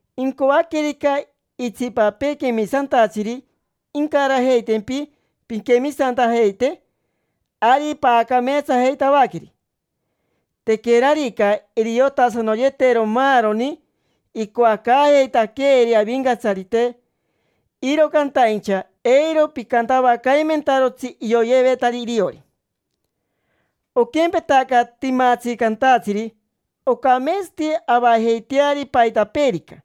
Incoaquerica itsipapee quemisantatsiri incarajeitempi pinquemisantajeite, ari paacameetsajeitavaqueri. Tequerarica iriotasanoyetero maaroni icoacaajeitaqueeri Avincatsarite, iro cantaincha eiro picantavacaimentarotsi ioyevetari iriori. Oquempetaca timatsi cantatsiri ocameetsati avajeiteari paitapeerica: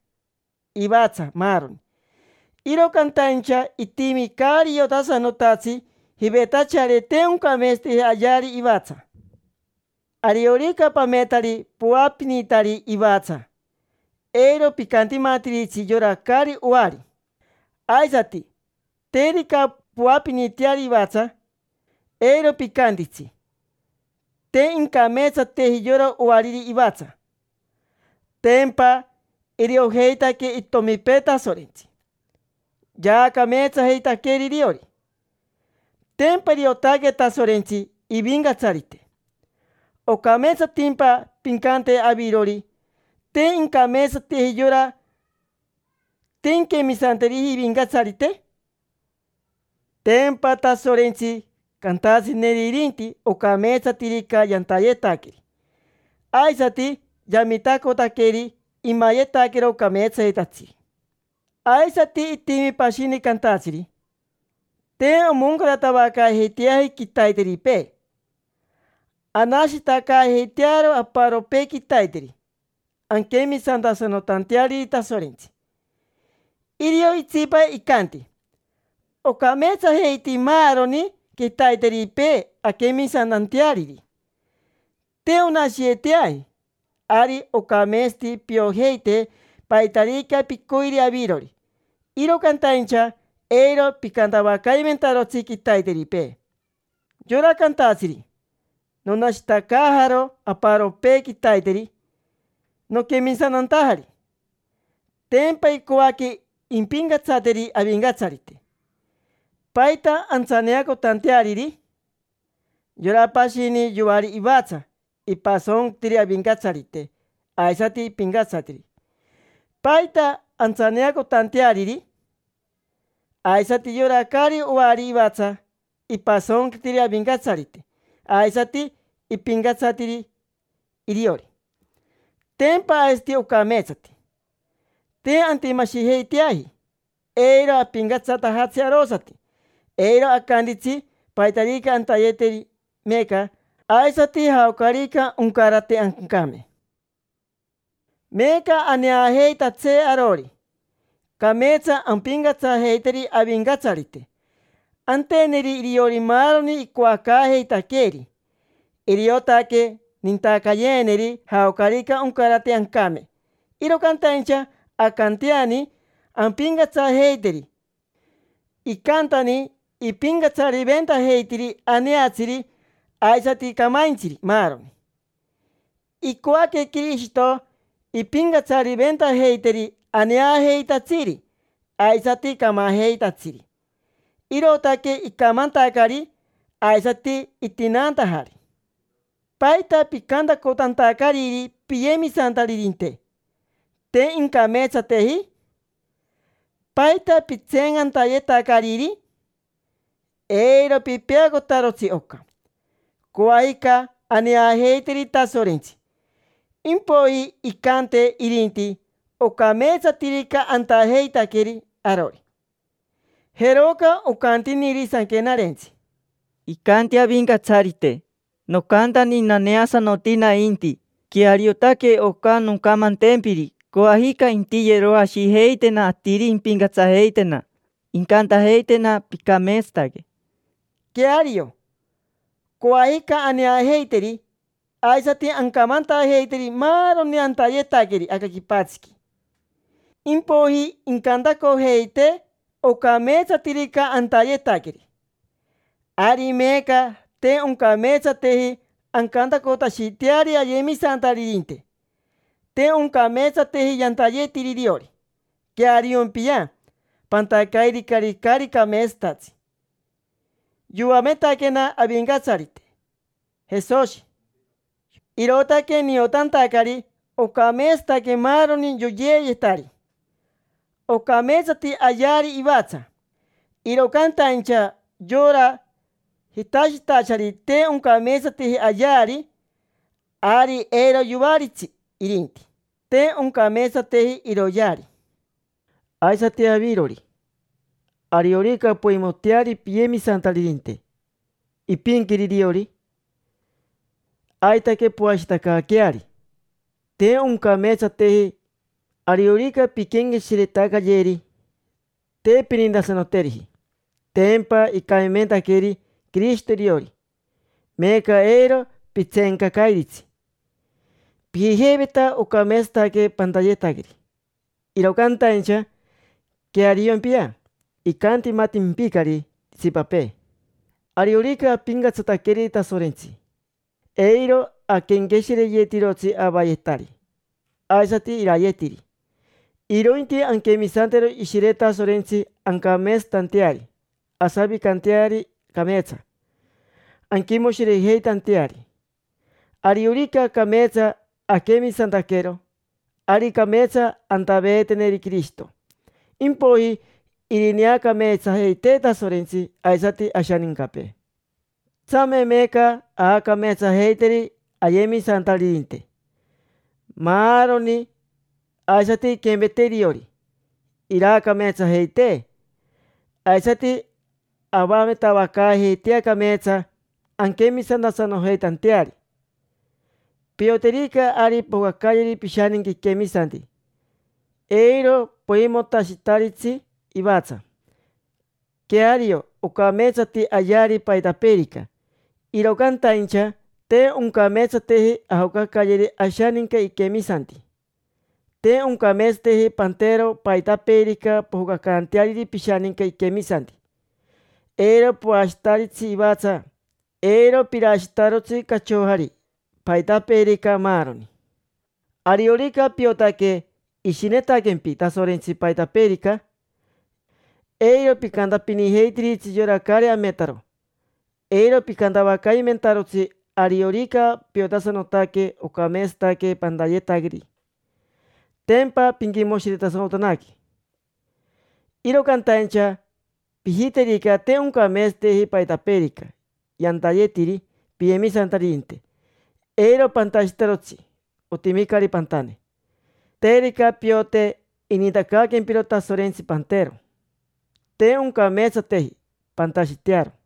ivatsa, maaroni. Iro cantaincha itimi caari iotasanotatsi: jivetachari te oncameetsateji ayeari ivatsa. Ariorica pametari poapinitari ivatsa, eiro picantimatiritsi yora caari oari. Aisati, terica poapiniteari ivatsa, eiro picantitsi: “Te incameetsateji yora oariri ivatsa”. Tempa iriojeitaque itomipee Tasorentsi, yaacameetsajeitaqueri iriori. Tempa iriotaque Tasorentsi ivincatsarite. ¿Ocameetsatimpa pincante avirori: “Te incameetsateji yora, te inquemisanteriji ivincatsarite”? Tempa Tasorentsi cantatsineri irinti ocameetsatirica yantayetaqueri, aisati yamitacotaqueri imayetaquero cameetsayetatsiri. Aisati itimi pashini cantatsiri: “Te omoncaratavacaajeiteaji quitaiteripee, anashitacaajeitearo aparopee quitaiteri anquemisantasanotanteariri Tasorentsi”. Irio itsipa icanti: “Ocameetsajeiti maaroni quitaiteripee anquemisantanteariri, te onashiyeteaji”. Ari ocameetsati piojeite paitarica picoiri avirori, iro cantaincha eiro picantavacaimentarotsi quitaiteripee. Yora cantatsiri: “Nonashitacaajaro aparopee quitaiteri noquemisantantajari”, tempa icoaque impincatsateri Avincatsarite. ¿Paita antsaneacotanteariri? Yora pashini, yoari ivatsa, ipasonquitiri Avincatsarite, aisati ipincatsatiri. ¿Paita antsaneacotanteariri? Aisati yora caari oari ivatsa, ipasonquitiri Avincatsarite aisati ipincatsatiri iriori. Tempa aisati ocameetsati. Te antimashijeiteaji, eiro apincatsatajatsi arosati. Eiro acantitsi paitarica antayeteri meeca, aisati jaocarica oncarate ancame. Meeca aneajeitatsee arori, cameetsa ampincatsajeiteri Avincatsarite, anteneri iriori maaroni icoacaajeitaqueeri. Iriotaque nintacayeeneri jaocarica oncarate ancame, iro cantaincha ancanteani ampincatsajeiteri. Icantani ipincatsariventajeitiri aneatsiri aisati camaintsiri, maaroni. Icoaque Quirishito impincatsariventajeiteri aneajeitatsiri aisati camajeitatsiri, irootaque icamantacari aisati itinaantajari. ¿Paita picantacotantacariri piyemisantaririnte: “Te incameetsateji”? ¿Paita pitseencantayetacariri? Eiro pipeacotarotsi oca: coajica aneajeiteri Tasorentsi, impoiji incante irinti ocameetsatirica antajeitaqueri arori. Jeroca ocantiniri Sanquenarentsi: “Icanti Avincatsarite: ‘Nocantani naneasanoti nainti, queariotaque oca noncamantempiri. Coajica intiyeroashijeitena atiri impincatsajeitena. Incantajeitena: Picameetsataque’”. Queario, coajica aneajeiteri, aisati ancamantajeiteri maaroni antayetaqueri aca quipatsiqui, impoiji incantacojeitee ocameetsatirica antayetaqueri. Ari meeca te oncameetsateji ancantacotashiteari ayemisantaririnte: “Te oncameetsateji yantayetiri iriori”. Queariompia, pantacairicari caari cameetsatatsi. Yoametaquena Avincatsarite Jesoshi, irootaque niotantacari ocameetsataque maaroni yoyeeyetari. Ocameetsati ayeari ivatsa. Iro cantaincha yora jitashitachari te oncameetsateji ayeari, ari eiro yoaritsi irinti; te oncameetsateji iroyeari. Aisati avirori, ariorica poimoteari piyemisantaririnte ipinquiri iriori, aitaque poashiretacaaqueari: te oncameetsateji. Ariorica pinquenqueshiretacayeri, te pinintasanoteriji. Tempa icamimentaqueri Quirishito iriori, meeca eiro pitseencacairitsi. Pijijeiveta ocameetsayetaque pantayetaqueri, iro cantaincha queariompia, icantimatimpicari itsipapee. Ariorica apincatsataqueri Tasorentsi, eiro aquenqueshireyetirotsi avayetari aisati irayetiri; irointi anquemisantero Ishire Tasorentsi ancameetsatanteari, asavicanteari cameetsa, anquimoshirejeitanteari. Ariorica cameetsa aquemisantaquero, ari cameetsa antaveeteneri Quirishito. Impoiji irineacameetsajeitee Tasorentsi aisati ashanincapee. Tsame meeca aacameetsajeiteri ayemisantaririnte, maaroni; aisati inquempetee iriori, iraacameetsajeitee. Aisati avametavacaajeitea cameetsa anquemisantasanojeitanteari. Pioterica ari pojocacayeri pishaninca iquemisanti, eiro poimotashitaritsi ivatsa. Queario ocameetsati ayeari paitapeerica, iro cantaincha te oncameetsateji ajocacayeri ashaninca iquemisanti. Te oncameetsateji pantero paitapeerica pojocacanteariri pishaninca iquemisanti: eiro poashitaritsi ivatsa, eiro pirashitarotsi cachojari, paitapeerica, maaroni. Ariorica piotaque ishinetaquempi Tasorentsi paitapeerica, eiro picantapinijeitiritsi yora caari ametaro, eiro picantavacaimentarotsi. Ariorica piotasanotaque ocameetsataque pantayetaqueri, tempa pinquimoshiretasanotanaque. Iro cantaincha pijiterica te oncameetsateji paitapeerica yantayetiri piyemisantaririnte, eiro pantashitarotsi, otimicari pantane. Terica piote inintacaaquempiro Tasorentsi pantero, te oncameetsateji pantashitearo.